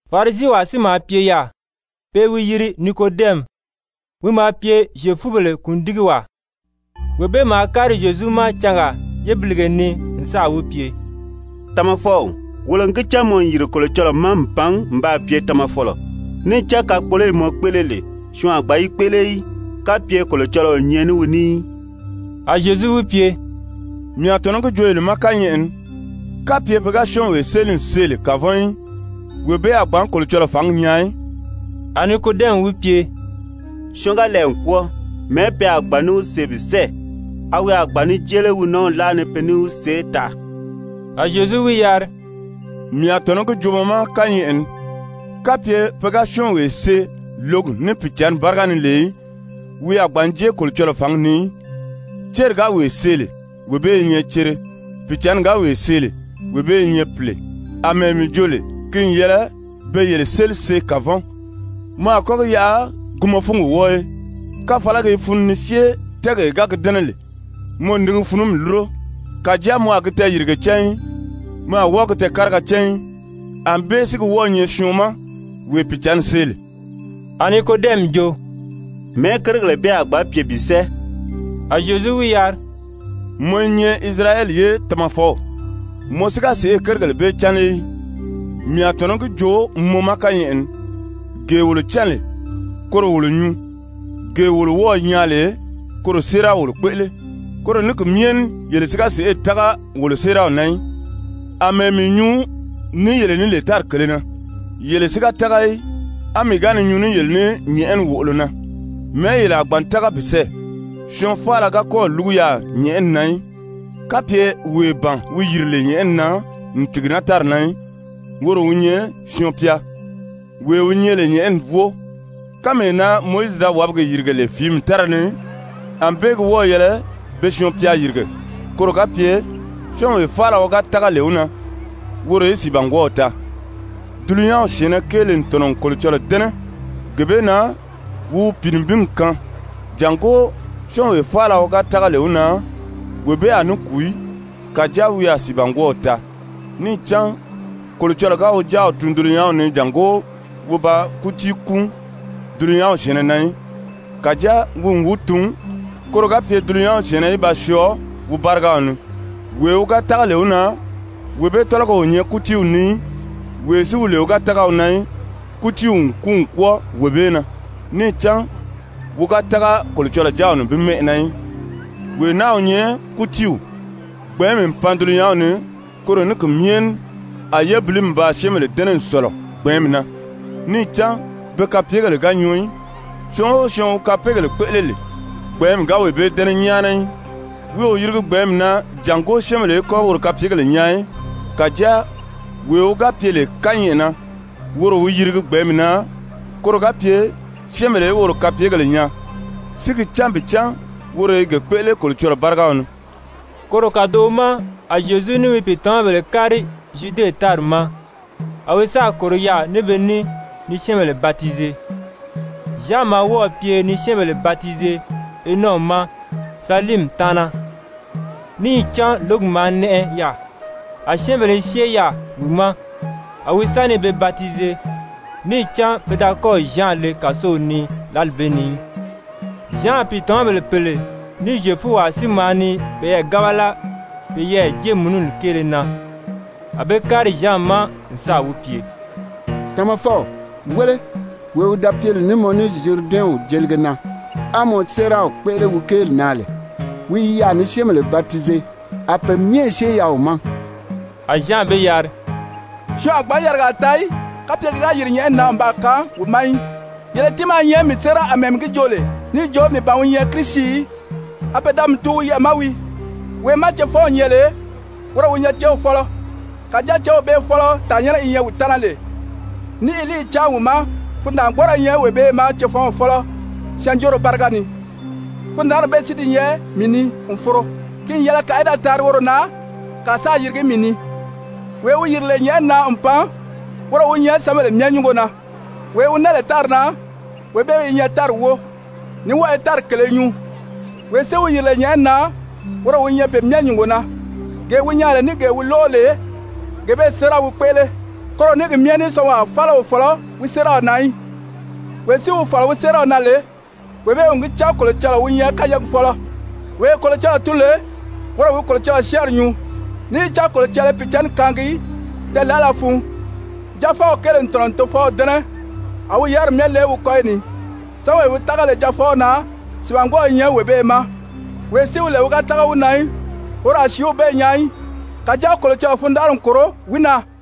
Farisiwaa si maa pye yaà, pe i wi yiri Nikodɛmi, wi maa pye Zyefubèle kùndigiwaa. Wee bee maa kári Zyezu ma cangaa yébilige ni n sáà wi pye: «Tamafɔw, wolo n gi cán mɔ n yìri Kolocɔlɔɔ ma n pan n baa pye tamafɔlɔ. Níì cán kakpoloyi mɔ kpéʔele lè, syɔɔn a gbǎn yi kpéʔele í, kapye Kolocɔlɔɔ o nyɛ ní wi ní í.» A Zyezu wi pye: «Mii a tɔ̀nɔ́ gi joo mɔ ma kányɛʔɛ ni, kapye pe ga syɔ́ɔnwee séli n see lè kavɔn í, wee bee a gbǎn Kolocɔlɔɔ fǎngi nyaa í.» A Nikodɛmi wi pye: «Syɔɔn ga lɛɛ n kwɔ́ɔ, mɛ̀ɛ́ pe a gbǎn ní wi see bi sɛ́ɛ? A wi a gbǎn ní jée lé wi nɔ́ɔw láʔa ni pe ní wi see taʔa?» A Zyezu wi yari: «Mii a tɔ̀nɔ́ gi joo mɔ ma kányɛʔɛ ni, kapye pe ga syɔ́ɔnwee see lǒgi ní Pìicǎnni báriga ni lè í, wi a gbǎn jée Kolocɔlɔɔ fǎngi ni í. Céri ga wee see lè, wee bee i nyɛ cere, Pìicǎnni ga wee see lè, wee bee i nyɛ pìle. Amɛɛ mii jo lè ki n yɛlɛ be yele séli see kavɔn, mɔ a kɔ́ gi yaʔa gi mɔ fúngi wɔ́ɔ í. Káfalagi i funu ni syée tɛ́ɛgee ga gi dɛ́nɛ lè, mɔ n ni gi funumi lúro. Kàjáa mɔ a gi tɛɛyìrige cán í, mɔ a wɔ́ɔ gi tɛɛ̀káriga cán í. Anbée si gi wɔ́ɔ̄ nyɛ syɔɔn ma, wee Pìicǎnni see lè.» A Nikodɛmi jo: «Mɛ̀ɛ́ kérigèle bee a gbǎn pye bi sɛ́ɛ?» A Zyezu wi yari: «Mɔ i nyɛ Isirayɛli ye tamafɔw, mɔ si ga sèʔê kérigèle bee cán lé í? Mii a tɔ̀nɔ́ gi joo mɔ ma kányɛʔɛ ni, gee wolo cán lè, koro wolo nyuu, gee wolo wɔ́ɔ̀ nyaa lè, koro séeraw wolo kpéʔele. Koro ní ki myɛ ní yele si ga sèʔê tága wolo séeraw na í. Amɛɛ mii nyuu ní yele ní lè tári kèlē na, yele si ga tága í, á mii ga ni nyuu ní yele ní nyɛ̀ʔɛni wòʔolo na, mɛ̀ɛ́ yele a gbǎn tága bi sɛ́ɛ? Syɔɔn faala ga kɔ́ɔ̀ lúgu yaà nyɛ̀ʔɛni na í, kapye wee ban wi yìri lè nyɛ̀ʔɛni na n tìgi naa tári na í, woro wi nyɛ Syɔɔn-pya, wee wi nyɛ lè nyɛ̀ʔɛni wóo. Kánmee na Mowizi da wàbigi yìrige lè fìími tára ni, ànbée gi wɔ́ɔ̀ yɛlɛ be Syɔɔn-pya yìrige, koro ga pye syɔ́ɔnwee faala wi ga tága lè wi na, woro í sìibangwɔɔw taa. Dulunyanw syɛ̀ɛnnɛ kéele n tɔ̀nɔ n Kolocɔlɔɔ dɛ́nɛ gee bee na wi wi Pìinibingi kaan, jàngó syɔ́ɔnwee faala wi ga tága lè wi na, wee bee a ní kùu í, kàjáa wi a sìibangwɔɔw taa. Níì cán Kolocɔlɔɔ ga wi Jáaw tun dulunyanw ni jàngó wi ba kútii kúun dulunyanw syɛ̀ɛnnɛ na í, kàjáa wi n wi tun, koro ga pye dulunyanw syɛ̀ɛnnɛ í ba syɔɔ wi bárigaw ni. Wee wi ga tága lè wi na, wee bee tɔ́lɔgɔ o nyɛ kútiiw ni í. Wee si wi lè wi ga tága wi na í, kútiiw n kúun n kwɔ́ɔ wee bee na, níì cán wi ga tága Kolocɔlɔɔ Jáaw nibin mɛ́ʔɛ na í. Wee naa wi nyɛ kútiiw, gbɛ̀ɛ́nmi n pan dulunyanw ni, koro ní ki myɛ ní a yébilimi baa syɛ́ɛnbèle dɛ́nɛ n sɔ̀lɔ gbɛ̀ɛ́nmi na, níì cán be kapyegèle ga nyɔɔ í. Syɔɔn o syɔɔn wi kapeegèle kpéʔele lè, gbɛ̀ɛ́nmi ga wee bee dɛ́nɛ nyáana í, wi o yirigi gbɛ̀ɛ́nmi na jàngó syɛ́ɛnbèle í kɔ́ woro kapyegèle nyaa í. Kàjáa wee wi ga pye lè kányɛʔɛ na, woro wi yirigi gbɛ̀ɛ́nmi na, koro ga pye syɛ́ɛnbèle í woro kapyegèle nyaa, si gi cán bi cán woro i ge kpéʔele Kolocɔlɔɔ bárigaw ni.» Koro kàdoʔo ma a Zyezu ní wi pìitamabèle kári Zyude tári ma. A wi sáà kòro yaà ní be ní ni syɛ́ɛnbèle batize. Zyan maa wɔ́ɔ̀ pye ni syɛ́ɛnbèle batize Enɔ ma saliimi taana, níì cán lǒgi maa nɛʔɛ yaà. A syɛ́ɛnbèle i syée yaà wi ma, a wi sa ni be batize. Níì cán pe da kɔ́ɔ̀ Zyan le kàsow ni lǎli bee ni í. Zyan pìitamabèle pèle ní Zyefuwaa si maa ni peyɛɛ gábala peyɛɛ jéemununi kéele na. A be kári Zyan ma n sáà wi pye: «Tamafɔw, wéle, wee wi da pye lè ní mɔ ní Zyuridɛnw jelige na, á mɔ séeraw kpéʔele wi kéeli na lè, wi i yaà ni syɛ́ɛnbèle batize, a pe myɛ i syée yaà wi ma.» A Zyan be yari: «Syɔɔn a gbǎn yarigaa taa í, kapye ki ga yìri nyɛ̀ʔɛni na n baa kaan wi ma í. Yele tiimaa i nyɛ mii séera, àmɛɛ mii gi joo lè níì jo mii ban wi nyɛ Kirisi í, a pe da mii tun wi yɛʔɛ̀ ma wii. Wee má cefɔnw nyɛ lè, woro wi céw fɔ́lɔ. Kàjáa céw bee fɔ́lɔ tàannyɛnnɛ wi nyɛ wi taana lè, ní i líiyi cáan wi ma, fundaangbɔɔrɔ i nyɛ wee bee ma cefɔnw fɔ́lɔ syɛɛnjóoro báriga ni. Fundaanri bee si di nyɛ mii ni n foro. Ki n yɛlɛ kàa í da taari woro na, kàa sáā yirigi mii ni. «Wee wi yìri lè nyɛ̀ʔɛni na n pan, woro wi nyɛ syɛ́ɛnbèle myɛ nyúngo na. Wee wi naa lè tári na, wee bee i nyɛ tári wóo, ní wɔ́ɔ i tári kèlē nyuu. Wee si wi yìri lè nyɛ̀ʔɛni na, woro wi nyɛ pe myɛ nyúngo na, gee wi nyaa lè ní gee wi lóʔo lè, gee bee séera wi kpéʔele, koro ní ki myɛ ní syɔɔnwaa faala o fɔ̀lɔ́ wi séeraw na í. Wee si wi fɔ̀lɔ wi séeraw na lè, wee bee n gi cán Kolocɔlɔɔ wi nyɛ kányɛɛgi fɔ́lɔ. Wee Kolocɔlɔɔ tun lè, woro wi Kolocɔlɔɔ syɛ́ɛnri nyuu, níì cán Kolocɔlɔɔ i Pìicǎnni kaangi tɛɛ̀laʔala fun. Jaafɔw kéele n Tofɔw dɛ́nɛ, a wi yáriri myɛ le wi kɔ́yi ni. Syɔ́ɔnwee wi tága lè Jaafɔw na, sìibangwɔɔw i nyɛ wee bee ma. Wee si wi lè wi ga tága wi na í, woro a sìíw bee nyaa í, kàjáa Kolocɔlɔɔ fundanʔari n kòro wi na.»